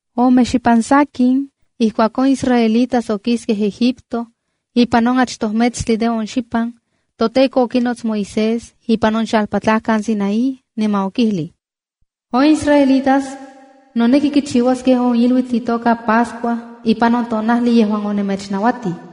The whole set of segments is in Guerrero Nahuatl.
Ome xipan sakin, ijkuak on israelitas okiskej Egipto, ipan on achtoj metstli de on xipan, toTEKO okinots Moisés ipan on xalpatlajkan Sinaí, niman okijlij: “On israelitas noneki kichiuaskej on iluitl itoka Pascua ipan on tonajli yejuan onemechnauatij.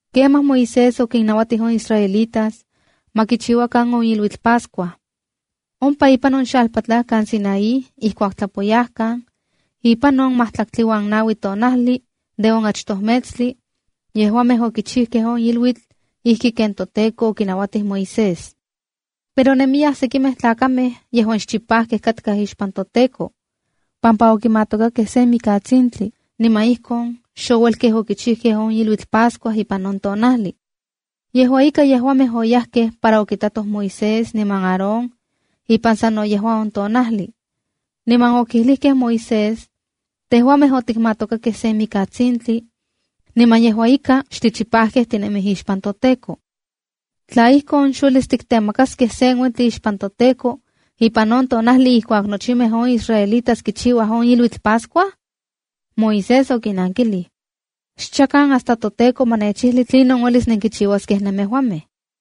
Kemaj Moisés okinnauatij on israelitas ma kichiuakan on iluitl Pascua. Ompa ipan on xalpatlajkan Sinaí ijkuak tlapoyajkan ipan on majtlaktli uan naui tonajli de on achtoj metstli, yejuamej okichijkej on iluitl ijki ken toTEKO okinauatij Moisés. Pero nemiyaj sekimej tlakamej yejuan xchipajkej katkaj ixpan toTEKO, pampa okimatokakej sen mikatsintli, niman ijkon xouelkej okichijkej on iluitl Pascua ipan on tonajli. Yejua ika, yejuamej oyajkej para okitatoj Moisés niman Aarón ipan sano yejua on tonajli, niman okijlijkej Moisés: —Tejuamej otikmatokakej sen mikatsintli, niman yejua ika xtichipajkej tinemij ixpan toTEKO. ¿Tla ijkon, xuelis tiktemakaskej sen uentli ixpan toTEKO ipan on tonajli ijkuak nochimej on israelitas kichiuaj on iluitl Pascua? Moisés okinnankilij: —Xchakan hasta toTEKO ma nechijli tlinon uelis nenkichiuaskej nemejuamej.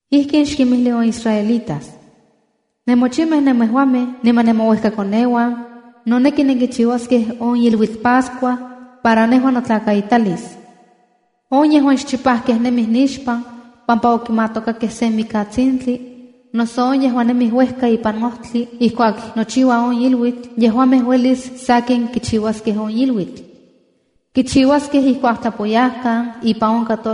“Ijkin xkinmijli on israelitas: Nemochimej nemejuamej niman nemouejkakoneuan noneki nenkichiuaskej on iluitl Pascua para nejua notlakaitalis. On yejuan xchipajkej nemij nixpan pampa okimatokajkej sen mikatsintli, noso on yejuan nemij uejka ipan ojtli ijkuak nochiua on iluitl, yejuamej uelis sakin kichiuaskej on iluitl. Kichiuaskej ijkuak tlapoyajkan ipan on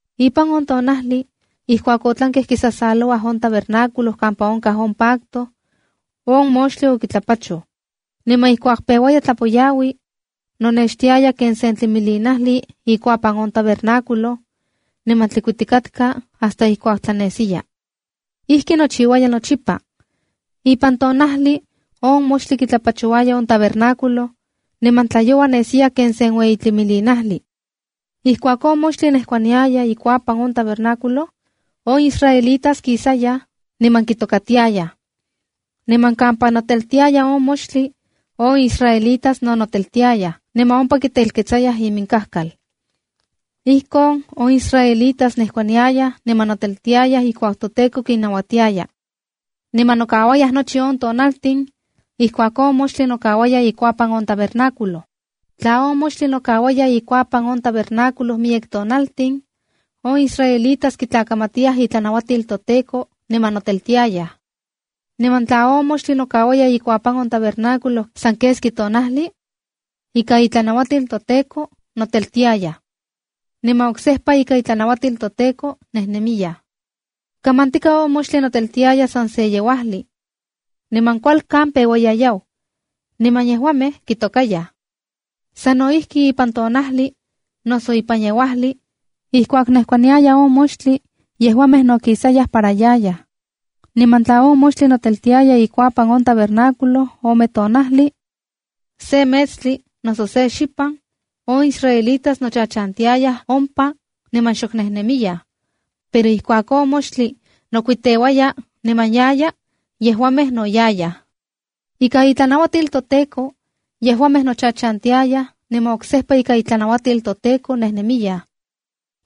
Ipan on tonajli ijkuak otlankej kisasalouaj on tabernáculo kampa onkaj on pacto, on moxtli okitlapachoj. Niman ijkuak peuaya tlapoyaui, nonextiaya ken sen tlimilinajli ikuapan on tabernáculo, niman tlikuitikatka hasta ijkuak tlanesiya. Ijki nochiuaya nochipa: Ipan tonajli on moxtli kitlapachouaya on tabernáculo, niman tlayoua nesiya ken sen ueyi tlimilinajli. Ijkuak on moxtli nejkuaniaya ikuapan on tabernáculo, on israelitas kisayaj niman kitokatiayaj. Niman kampa noteltiaya on moxtli, on israelitas no noteltiayaj, niman ompa kitelketsayaj iminkajkal. Ijkon on israelitas nejkuaniayaj niman noteltiayaj ijkuak toTEKO kinnauatiaya, niman nokauayaj nochi on tonaltin ijkuak on moxtli nokauaya ikuapan on tabernáculo. Tla on moxtli nokauaya ikuapan on tabernáculo miyek tonaltin, on israelitas kitlakamatiyaj itlanauatil toTEKO niman noteltiayaj. Niman tla on moxtli nokauaya ikuapan on tabernáculo san keski tonajli, ika itlanauatil toTEKO noteltiayaj. Niman oksejpa ika itlanauatil toTEKO nejnemiyaj. Kamantika on moxtli noteltiaya san se yeuajli, niman kualkan peuaya yau, niman yejuamej kitokayaj. Sa no ijki ipan tonajli noso ipan yeuajli, ijkuak nejkuaniaya on moxtli, yejuamej no kisayaj para yayaj. Niman tla on moxtli noteltiaya ikuapan on tabernáculo ome tonajli, se metstli, noso se xipan, on israelitas nochachantiayaj ompa niman xok nejnemiyaj. Pero ijkuak on moxtli nokuiteuaya niman yaya, yejuamej no yayaj. Ika itlanauatil toTEKO yejuamej nochachantiayaj, niman oksejpa ika itlanauatil toTEKO nejnemiyaj.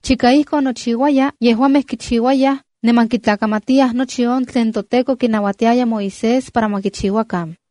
Chika ijkon nochiuaya, yejuamej kichiuayaj niman kitlakamatiyaj nochi on tlen toTEKO kinauatiaya Moisés para ma kichiuakan.